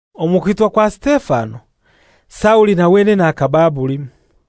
Omu kwitwa kwa Sitefano, Sauli na wenene akaba abulimu.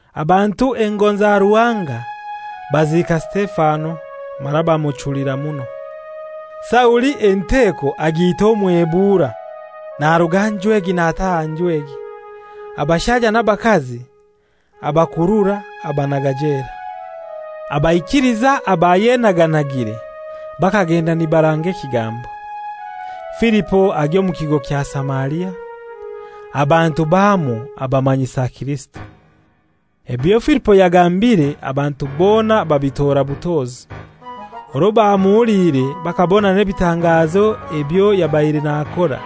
Abantu engonza Ruhanga baziika Sitefano, mara bamuchulira muno. Sauli enteko agiita omwebura, naruga nju egi nataaha nju egi, abashaija n'abakazi abakurura abanaga jela. Abaikiliza abayenaganagire bakagenda nibaranga ekigambo. Filipo agya omu kigo kya Samaria; abantu bamwo abamanyisa Kirisito. Ebyo Filipo yagambire abantu bona babitora butozi, orwo bamuhuliire bakabona n'ebitangazo ebyo yabaire nakora.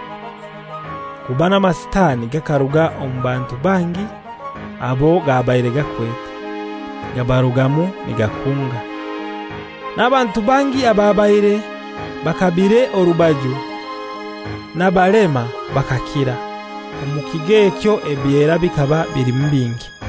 Kuba n'amasitani gakaruga omu bantu bangi abo gabaire gakwete, gabarugamu nigakunga. N'abantu bangi ababaire bakabiire orubaju n'abalema bakakira. Omu kigo ekyo ebyera bikaba bilimu bingi.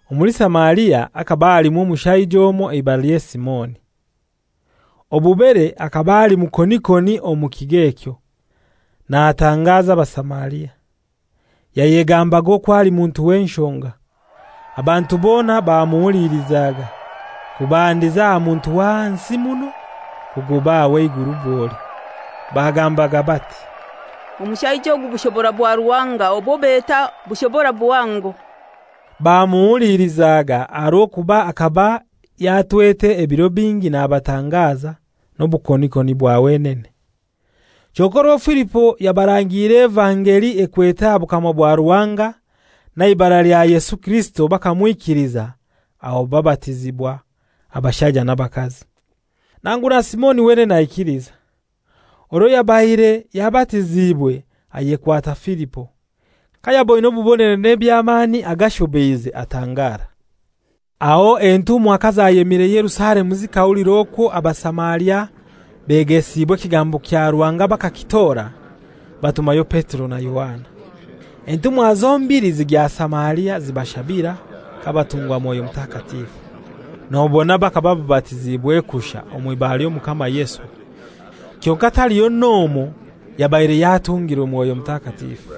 Omuli Samaria hakaba halimu omushaija omoi eibaralye Simoni, obubere akaba ali mukonikoni omu kigo ekyo, natangaza Abasamaria. Yayegambaga okwo ali muntu w'enshonga. Abantu bona bamuhulilizaga, kubandiza aha muntu w'ahansi muno kugoba aha w'eiguru bwoli. Bagambaga bati, «Omushaija ogu bushobora bwa Ruhanga obwo beta, ‹Bushobora buhango.›» Bamuhuliilizaga, aha rw'okuba akaba yatwete ebiro bingi nabatangaza n'obukonikoni bwa wenene. Kyonkai orwo Filipo yabarangiire evangeli ekwete aha Bukama bwa Ruhanga n'aha ibara lya Yesu Kirisito bakamwikiliza aho babatizibwa abashaija n'abakazi. Nangu na Simoni wenene aikiliza; orwo yabaire yabatiziibwe ayekwata Filipo. Kayaboine obubonero n'ebyamani agashobeize atangara. Aho entumwa kazayemire Yerusalemu zikahulira okwo Abasamaria begesibwe ekigambo kya Ruhanga bakakitora, batumayo Petero na Yohana. Entumwa zombili zigya Samaria zibashabira kabatungwa Mwoyo Mutakatifu. Nobona bakaba babatiziibwe kushai omw'ibara ly'Omukama Yesu, kyonkai taliho n'omoi yabaire yatungirwe Mwoyo Mutakatifu.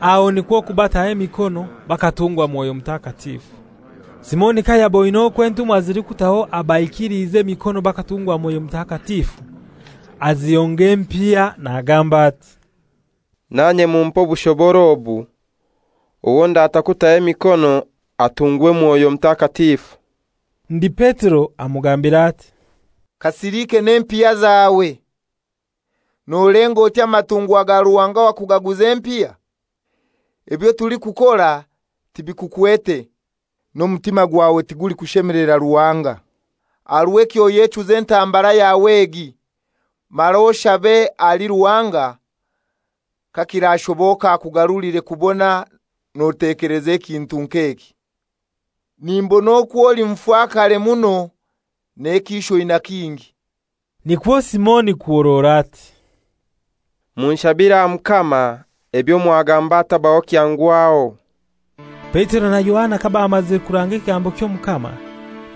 Aho nikwo kubataho emikono bakatungwa Mwoyo Mutakatifu. Simoni kayaboine okwo entumwa zilikutaho abaikiliize emikono bakatungwa Mwoyo Mutakatifu, azihonga empiya nagamba ati, «Nanye mumpe obushobora obu, owo ndata kutaho emikono atungwe Mwoyo Mutakatifu.» Ndi Petero amugambira ati, «Kasilike n'empiya zawe! Nolenga oti amatungwa ga Ruhanga wakugaguza empiya? Ebyo tulikukora tibikukwete, n'omutima gwawe tigulikushemelera Ruhanga. Aha rw'ekyo oyechuze entambara yawe egi, mara oshabe ahali Ruhanga, kakirashoboka akugarulire kubona notekeleza ekintu nk'eki. Nimbona okwo oli mufakare muno n'ekiisho oina kingi.» Nikwo Simoni kuhorora ati, «Munshabire aha Mukama, ebyo mwagamba hatabaho kyangwaho.» Petero na Yohana kabamazire kuranga ekigambo ky'Omukama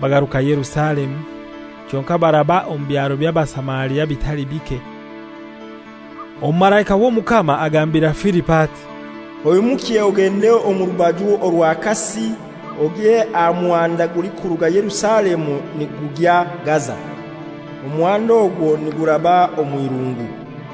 bagaruka Yerusalemu, kyonkai baraba omu byaro by'Abasamaria bitali bike. Omumalaika w'Omukama agambira Filipo ati, «Oimukye ogende omu rubaju orwa kasi ogye aha muhanda gulikuruga Yerusalemu nigugya Gaza.» Omuhanda ogwo niguraba omw'inguru.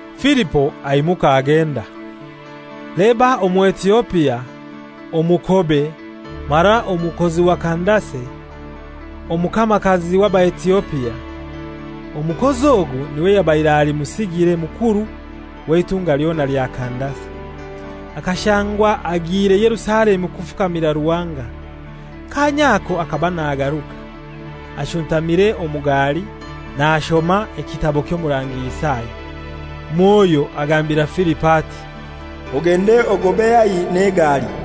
Filipo aimuka agenda. Leba Omuetiopia, omukobe, mara omukozi wa Kandase, omukamakazi w'Abaetiopia. Omukozi ogu n'iwe yabaire ali musigire mukuru w'eitunga lyona lya Kandase. Akashangwa agiire Yerusalemu kufukamira Ruhanga. Kaanya ako akaba nagaruka, ashuntamire omu gali nashoma ekitabo ky'Omurangi Isaya. Mwoyo agambira Filipo ati, «Ogende ogobe haihi n'egali.»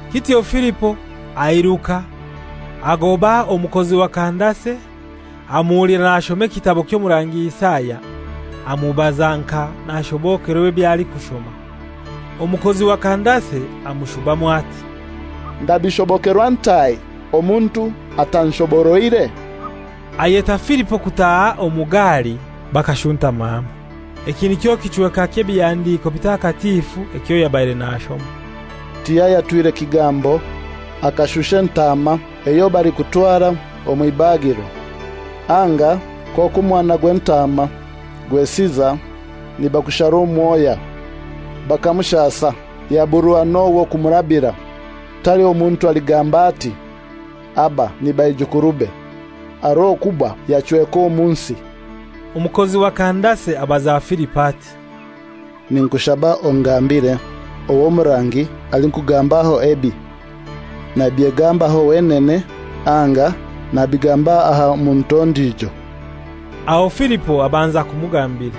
Kityo Filipo airuka agoba omukozi wa Kandase, amuhulira nashoma ekitabo ky'Omurangi Isaya, amubaza nka nashobokerwa ebyo alikushoma. Omukozi wa Kandase amushubamu ati, «Ndabishobokerwa ntai omuntu atanshoboroire?» Ayeta Filipo kutaaha omu gali bakashuntama hamoi. Eki nikyo kichweka ky'Ebihandiko Bitakatifu ekyo yabaire nashoma: «Tiyayatwire kigambo, akashusha entaama eyo balikutwara omw'ibagiro, anga nk'okwo omwana gw'entaama gwesiza nibagushara omwoya. Bakamushasa yaburwa n'ow'okumurabira. Taliho muntu aligamba ati, ‹Aba ni baijukurube;› aha rw'okuba yachweka omu nsi.» Omukozi wa Kandase abaza Filipo ati, «Ninkushaba ongambire ow'omurangi alikugambaho ebi. Nabyegambaho wenene anga nabigamba aha muntu ondijo?» Aho Filipo abanza kumugambira.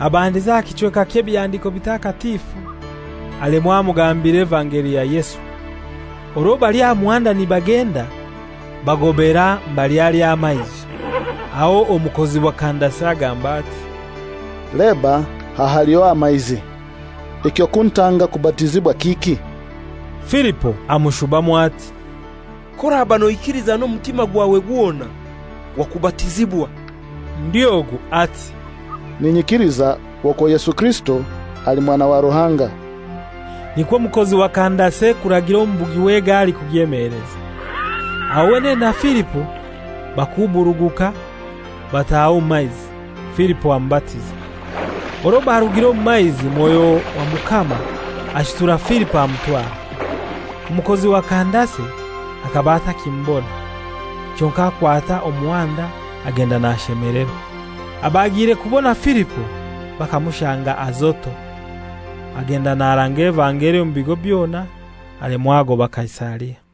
Abandiza aha kichweka ky'Ebihandiko Bitakatifu, alemwa amugambira Evangeli ya Yesu. Orwo bali aha muhanda nibagenda bagobaera mbali hali amaizi, aho omukozi wa Kandase agamba ati, «Leba aha haliho amaizi! Eky'okuntanga kubatizibwa kiki?» [Filipo amushubamu ati, «K'oraba noikiliza n'omutima gwawe gwona, wakubatizibwa.» Ndi ogu ati, «Ninyikiliza okwo Yesu Kirisito ali Mwana wa Ruhanga.»] Nikwo omukozi wa Kandase kuragira omubugi w'egali kugyemeleza. Aho wenene na Filipo bakuburuguka bataha omu maizi, Filipo amubatiza. Orwo barugire omu maizi, Mwoyo wa Mukama ashutura Filipo amutwara; omukozi wa Kandase akaba atakimubona, kyonkai akwata omuhanda agenda nashemelerwa. Abagiire kubona Filipo bakamushanga Azoto. Agenda naranga evangeli omu bigo byona alemwa agoba Kaisaria.